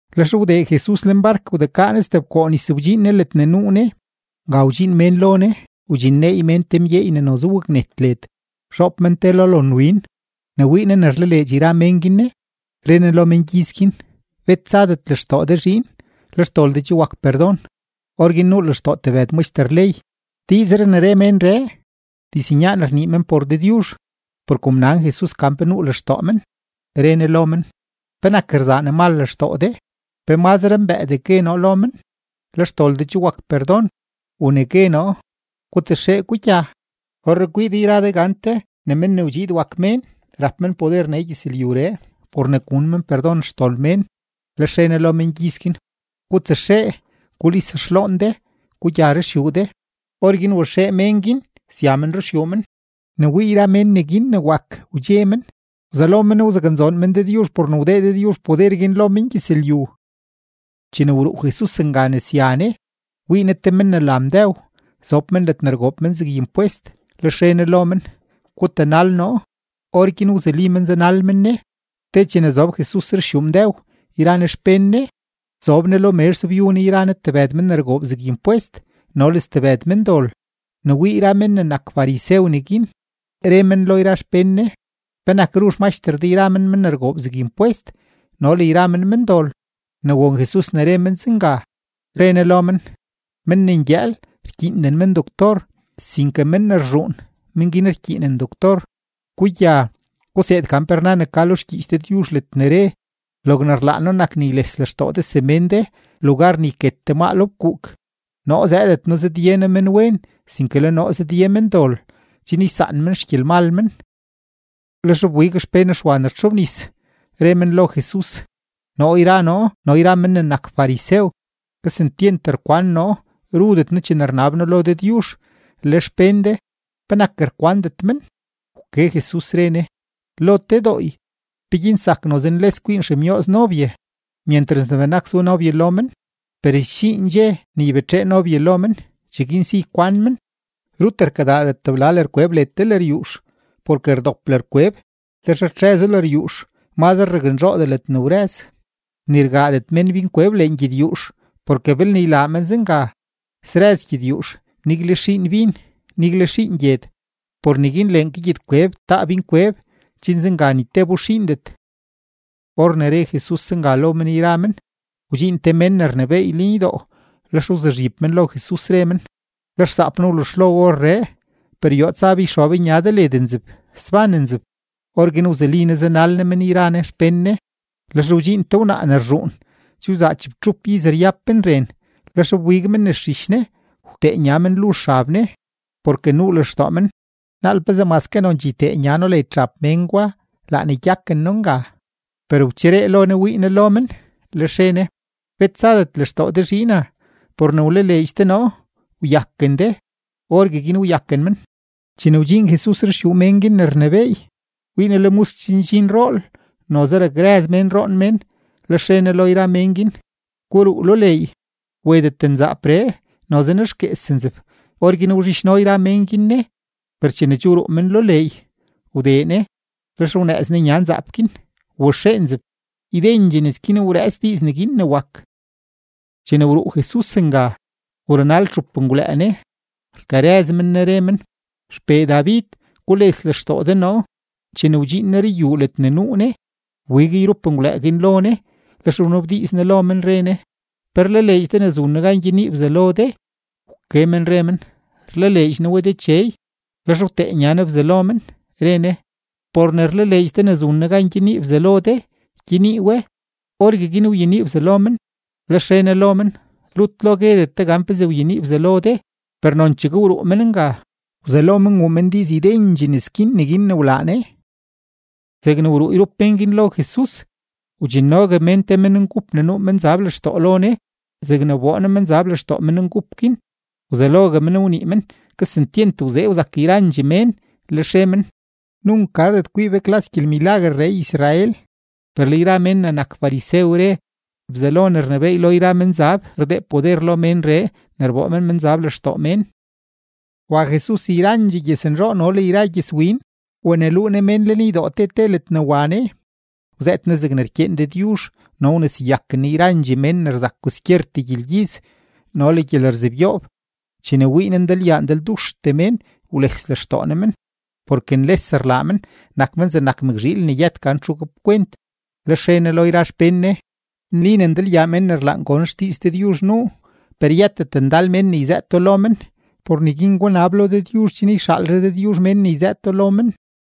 Lex wdee Jesus lenbark, wdekaa Ne stebkoo nis wdxiin Ne ledne nuu Ne. Nga wdxiin mén lo Ne, wdxinneey mén te mgyeey ne noze waknet led, zhoob men te lo lonwin. Ne wii Ne ne rlaleedx yra mén guin Ne, re Ne lo mengyiz guin: ―Bet tsadet lextoo de zhiin, le xdol de che wak perdon. Orguin nuu lextoo tebëd maxter ley: “Diizree ne re ménree, diznyaan rnii men por Dëdyuzh.” Per kom nan Jesus gan pe nuu lextoo men, re Ne lo men: ―¿Penak rzaa ne mal lextoo de? ¿Pe mazre mbëëdee gue noo lo men: “Le xdol de che wak perdon”, u ne gue noo: “Gutsaxee, gugya”? Orree kwii de yra de gante ne Men ne wdxiid wak Mén rap men poder nee gyëzlyuree por ne gun men perdon xdol mén. Lex re Ne lo mengyiz guin: ―Gutsaxee gulis xloon de, gugya ruxyuu de. Orguin waxee mén guin sya men ruxyuu men. Ne wii yra mén neguin ne wak, wdxe men, wzelo men wzaknzoon men Dëdyuzh por ne wdee Dëdyuzh poder guin lo mengyëzlyu. Chene wruu Jesus nga ne sya Ne, wii Ne te men ne la Mdëw, zob men ledne rgoob men zeg impwest, lex re Ne lo men: ―Gutanal noo. Orguin wzuli men zanal men Ne. Te chene zob Jesus ruxyuu Mdëw yra Ne xpén Ne, zob Ne lo mezh zobyu Ne yra Ne tebëd men ne rgoob zeg impwest no le stebëd mendol. Ne wii yra men ne nak farisew neguin, re men lo yra xpén Ne: ―¿Penak ru xmaxter de yra men men ne rgoob zeg impwest no le yra men mendol? Ne won Jesus ne re men zenga, re Ne lo men: ―Men ne ngyëël, rkyiinden men doctor, sinke men ne rzhuun, men guin rkyiinen doctor. Gugya, guseed gan pe rna ne ka lo xgyiich Dëdyuzh ledne re: “Logne rlaan noo nak ne yles lextoo de semén de, lugar ne rket de maa lo fkuuk.” Noo zëëdet noo zëdye noo menwen, sinke le noo zëdye mendol chen ysaan men xgyelmal men. Lex wbig xpén Xwa ne rtxobnis, re men lo Jesus: ―Noo yra noo no yra men ne nak farisew, kesentyent rkwan noo rudet noo chene rnab noo lo Dëdyuzh, le xpén de, ¿penak rkwandet men? Wke Jesus, re Ne: ―Lo te dooy, ¿peguin zak noze nles kwiin xemyooz nobye myentras ne benak zu nobye lo men? Per sdxiin dxe ne ybetxee nobye lo men; cheguin si ykwan men. ’Rut rkadaadet tebla lërkweb led te lëryuux, porke rdop lërkweb, lex rtxëzo lëryuux, mazre raknzhoodee ledne wrëz. Ni rgaadet mén binkweb lengyedyuux, porke belne ylaa men zenga, srëz gyedyuux, nigle xiin bin, nigle xiin gyed. Por neguin leen ke gyedkweb taa binkweb, chen zenga ni tebo xiindet. Or ne re Jesus zenga lo men yra men, wdxiin te mén ne rnebééy lenydoo, lex wzuzhib men lo Jesus, re men: ―Le xsaap noo wluzhlo orree, per yoo tsa be yxob nya de led nzeb, sban nzeb. Orguin wzuli Ne zanal Ne men yra Ne xpén Ne. Lex wdxiin te wnaa ne rzhuun, che wzaa chibtxup iz ryab men ren, lex wbig men nes zhich Ne wtee nya men luzh xab Ne, porke nuu lextoo men: “Naal pezee maske nonchee ytee nya noo led xab mén gwa, laa ne gyaken noo nga.” Per wcheree lo Ne wii Ne lo men, lex re Ne: ―Bet tsadet lextoo de zhiina; por ne wlaleedx de noo, wyaken de. Orgueguin wyaken men. Chene wdxiin Jesus ruxyuu mén guin ne rnebééy, wii Ne ne le musk che ndxin rool, noze rakrëz mén roon mén. Lex re Ne lo yra mén guin: ―Guruu lo leey. Wetet nzaapree, noze nexguees nzeb. Orguin wzhidxno yra mén guin Ne, per chene che wruu men lo leey, wdee Ne, lex wnëëz Ne nya nzaap guin, waxee nzeb. Ydendxee nes guin wrëëts diiz neguin ne wak. Chene wruu Jesus nga, wrunal txup menngwlëë Ne, rkarëz men Ne, re men: ―¡XPee David, gules lextoo de noo! Chene wdxiin Ne ruyuu ledne nuu Ne, wbig yrup menngwlëë guin lo Ne; lex wnabdiiz Ne lo men, re Ne: ―¿Pe rlaleedx de ne zun noo gan gyenii bzalo de? Wke men re men: ―Rlaleedx noo we, Dechey. Lex wtee nya Ne bzalo men, re Ne: ―Por ne rlaleedx de ne zun noo gan gyenii bzalo de, gyenii we. Orgueguin wyenii bzalo men. Lex re Ne lo men: ―Rut lo guedet de gan pezee wyenii bzalo de. Per nonchegue wruu men nga, wzelo men wuu men diiz ydendxee nes guin neguin ne wlaa Ne. Zegne wruu yrup mén guin lo Jesus, wdxinnogue mén te menngup ne nuu menzab lextoo lo Ne. Zegne wboo Ne menzab lextoo menngup guin, wzelogue men wnii men. Kesentyent wzee wzak yrandxee mén, lex re men: ―¡Nunk gardet kwii be klas gyelmilaguerree Israel! Per le yra men ne nak farisew re: ―Bzelo ne rnebééy lo yra menzab rdee poder lo ménree ne rboo men menzab lextoo mén. Wa Jesus yrandxee gyëznzhoo no le rya gyëzwin, wneluu Ne mén lenydoo te te ledne wa Ne, wzëët Ne zegne rkyeen Dëdyuzh no wneseyaken Ne yrandxee mén ne rzak kwaskyertee gyelgyiz no le gyelerzebyoob. Chene wii Ne ndalyaa ndalduxtee mén, wles lextoo Ne men, porke nles rlaa men, nak men zegnak mëkzhiil ne yët gan txu gapkwent. Lex re Ne lo yra xpén Ne: ―Nli ne ndalyaa mén ne rlaan gon xdiiz Dëdyuzh nuu, per yëtet ndal mén ne yzëëto lo men. Por neguin gunab lo Dëdyuzh chen yxaalre Dëdyuzh mén ne yzëëto lo men.